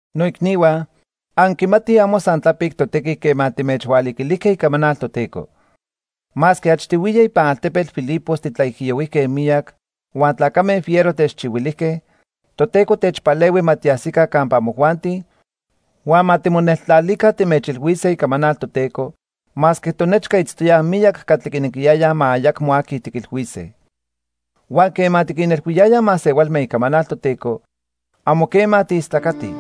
Noicnihua, anquimatij amo san tlapic totequi quema timechhualiquilijque icamanal Toteco. Masque achtihuiya ipan altepetl Filipos titlaijiyohuijque miyac huan tlacame fiero techchihuilijque, Toteco techpalehui ma tiajsica campa amojuanti huan ma timoneltlalica timechilhuise icamanal Toteco masque tonechca itztoyaj miyac catli quinequiyayaj ma ayacmo aqui tiquilhuise. Huan quema tiquinilhuíaj masehualme icamanal Toteco, amo quema tiistlacatij,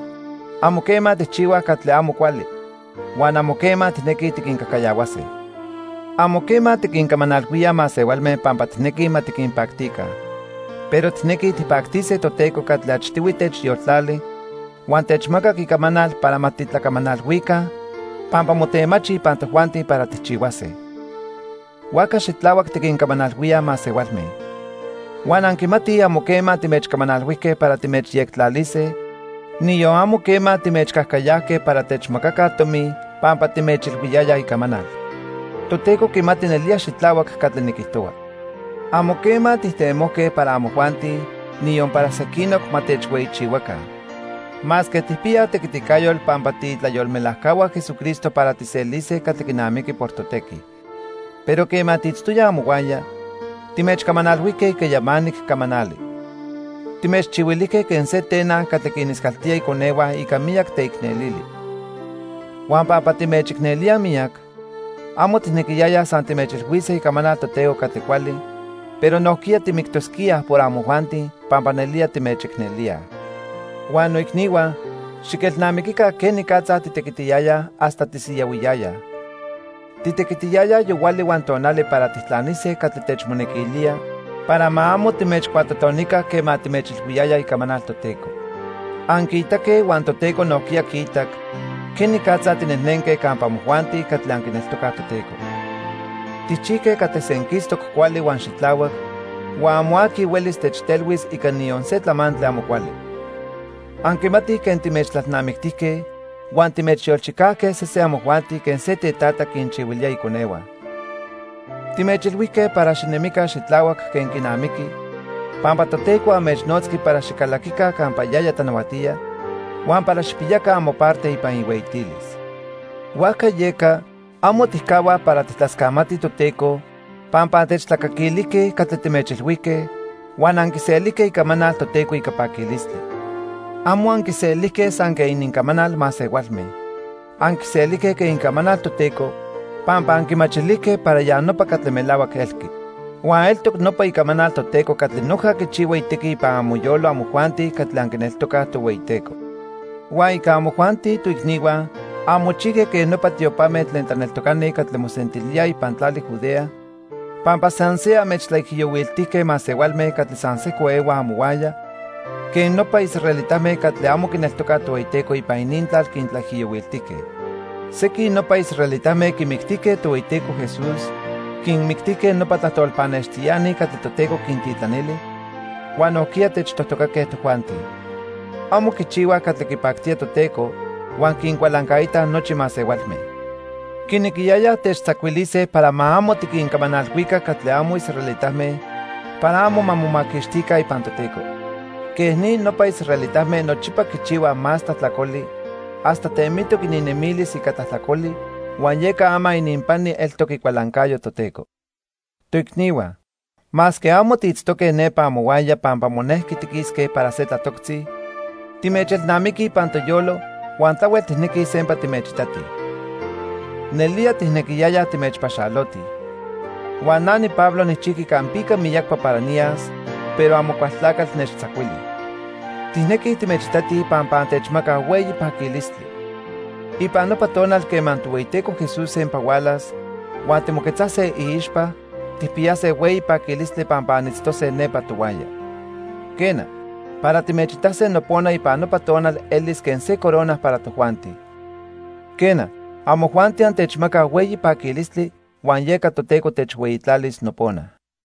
amo quema tijchihuaj catli amo cuali, huan amo quema tijnequij tiquincajcayahuase. Amo quema tiquincamanalhuíaj masehualme pampa tijnequij ma tiquinpactica. Pero tijnequi tijpactise Toteco catli achtihui techyoltlachili huan techmacac icamanal para ma titlacamanalhuica pampa motemachi ipan tojuanti para tijchihuase. Huajca xitlahuac tiquincamanalhuíaj masehualme. Huan anquimatij amo quema timechcamanalhuijque para timechyectlalise, niyon amo quema timechcajcayajque para techmacaca tomi pampa timechilhuiyayaj icamanal. Toteco quimati nelía xitlahuac catli niquijtohua. Amo quema tijtemojque para amojuanti, niyon para sequinoc, ma techhueyichihuaca. Masque tijpiyaj tequiticayotl pampa tiitlayolmelajcahua Jesucristo para tijselise catli quinamiqui por totequi. Pero quema tiitztoyaj amohuaya, timechcamanalhuijque ica yamanic camanali. Timechchihuilijque quen se tenan catli quiniscaltía iconehua ica miyac teicnelili. Huan pampa timechicnelíaj miyac, amo tijnequiyayaj san timechilhuise icamanal Toteco catli cuali, pero nojquiya timictosquíaj por amojuanti, pampa nelía timechicnelíaj. Huan noicnihua, xiquelnamiquica quenicatza titequitiyayaj hasta tisiyahuiyayaj. Titequitiyayaj yohuali huan tonali para tijtlanise catli techmonequilía para ma amo timechcuatotonica quema timechilhuiyayaj icamanal Toteco. Anquiitaque huan Toteco nojquiya quiitac quenicatza tinejnenque campa amojuanti catli anquineltocaj Toteco. Tijchijque catli senquistoc cuali huan xitlahuac, huan amo aqui huelis techtelhuis ica niyon se tlamantli amo cuali. Anquimatij quen timechtlalnamictijque huan timechyolchicajque sesen amojuanti quen se tetata quinchihuilía iconehua. Timechilhuijque para xinemica xitlahuac quen quinamiqui pampa Toteco anmechnotzqui para xicalaquica campa yaya tlanahuatía huan para xijpiyaca amoparte ipan ihueyitilis. Huajca yeca, amo tijcahuaj para tijtlascamatij Toteco pampa antechtlacaquilijque catli timechilhuijque huan anquiselijque icamanal Toteco ica paquilistli. Amo anquiselijque san quen inincamanal masehualme. Anquiselijque quen icamanal Toteco pampa anquimachilijque para ya nopa catli melahuac elqui. Huan eltoc nopa icamanal Toteco catli noja quichihua itequi ipan amoyolo amojuanti catli anquineltocaj Tohueyiteco. Huan ica amojuanti, toicnihua, anmochijque quen nopa tiopame tlen tlaneltocani catli mosentilíaj ipan tlali Judea pampa san se anmechtlaijiyohuiltijque masehualme catli san sejco ehuaj amohuaya quen nopa israelitame catli amo quineltocaj Tohueyiteco ipan inintlal quintlaijiyohuiltijque. Sequin nopa israelitame quimictijque Tohueyiteco Jesús, quinmictijque nopa tlajtol pannextiani catli Toteco quintitlanili, huan nojquiya techtojtocaque tojuanti. Amo quichihuaj catli quipactía Toteco huan quincualancaitaj nochi masehualme. Quinequiyayaj techtzacuilise para ma amo tiquincamanalhuica catli amo israelitame para amo ma momaquixtica ipan Toteco. Quej ni, nopa israelitame nochipa quichihuaj más tlajtlacoli hasta temitoc ininnemilis ica tlajtlacoli, huan yeca ama ininpani eltoc icualancayo Toteco. Toicnihua, masque amo tiitztoque nepa amohuaya pampa monejqui tiquisque para se tlatoctzi, timechelnamiquij ipan toyolo huan tlahuel tijnequij sempa timechitatij. Nelía tijnequiyayaj timechpaxalotij. Huan na niPablo nijchijqui campica miyacpa para niyas, pero Amocualtlacatl nechtzacuili. Tijnequij timechitatij pampa antechmacaj hueyi paquilistli. Ipan nopa tonal quema Tohueyiteco Jesús sempa hualas huan timoquetzase iixpa, tijpiyase hueyi paquilistli pampa anitztose nepa tohuaya. Quena, para timechitase nopona ipan nopa tonal elis quen se corona para tojuanti. Quena, amojuanti antechmacaj hueyi paquilistli huan yeca Toteco techhueyitlalis nopona.